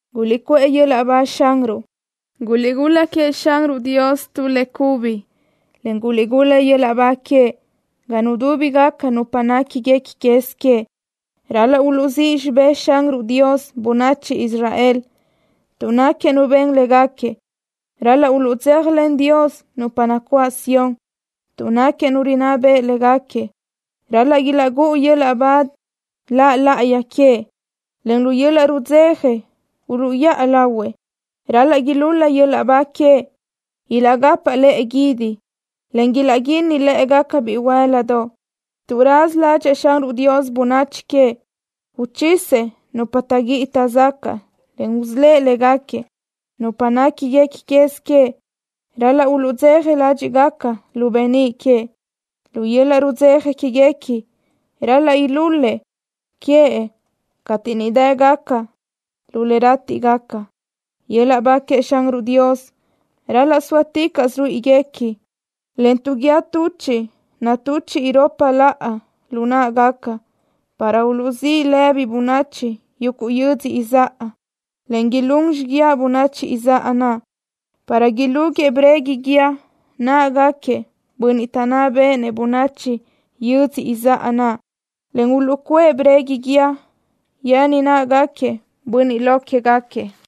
¡Guliʼcuʼë yöl-laʼ ba Xanruʼ! ¡Guliʼgul-la queëʼ Xanruʼ Dios tu le cubi, en guliʼgul-la yöl-laʼ ba queëʼ ga nudúbigaca nupa néquiguequi quez queëʼ! Ral-laʼ uluʼzíʼ xibë́ʼ Xanruʼ Dios bönachi Israel, tuʼ náquiëʼ Nu ben léguequi. Ral-laʼ uluʼdzéjalen Dios nupa nacuáʼ Sión, tuʼ náquiëʼ Nu rinná beʼe léguequi. Ral-laʼ ilaʼgúʼu yöl-laʼ ba La laʼayi queëʼ, en lu yöl-laʼ rudzeja uluʼyáʼa lahuëʼ. Ral-laʼ ilúl-la yöl-laʼ ba queëʼ, ilaʼcapaʼ lëʼe guídi, en ilaʼquínni lë́ʼegaca bihuë́l-ladoʼ, tuʼ raza ládxëʼë Xanruʼ Dios bönachi queëʼ. Uchisëʼ nupa taʼguíʼi taʼzacaʼ, en usölë́ʼ léguequi. Nupa néquiguequi quez queëʼ ral-laʼ uluʼdzeja ládxiʼgaca lu beníʼ queëʼ. Lu yöl-laʼ rudzeja quéguequi ral-laʼ ilúl-la queëʼ cateʼ niʼ dë́gaca lu le rátiʼgaca. Yöl-laʼ ba queëʼ Xanruʼ Dios ral-laʼ sóaticaʼsö ruíʼiguequi, en tu guíë tuchiʼ natuchiʼ iropa laʼa lu náʼagaca, para uluʼzíʼ lëbi bönachi yuguʼ yödzö izáʼa, en ilún xiguiaʼ bönachi izáʼa naʼ, para ilúguëʼë breguiʼ guíë náʼagaquiëʼ bönniʼ taʼná béʼenëʼ bönachi yödzö izáʼa naʼ, en uluʼcuʼë breguiʼ guíë yen náʼagaquiëʼ bönniʼ lo quégaquiëʼ,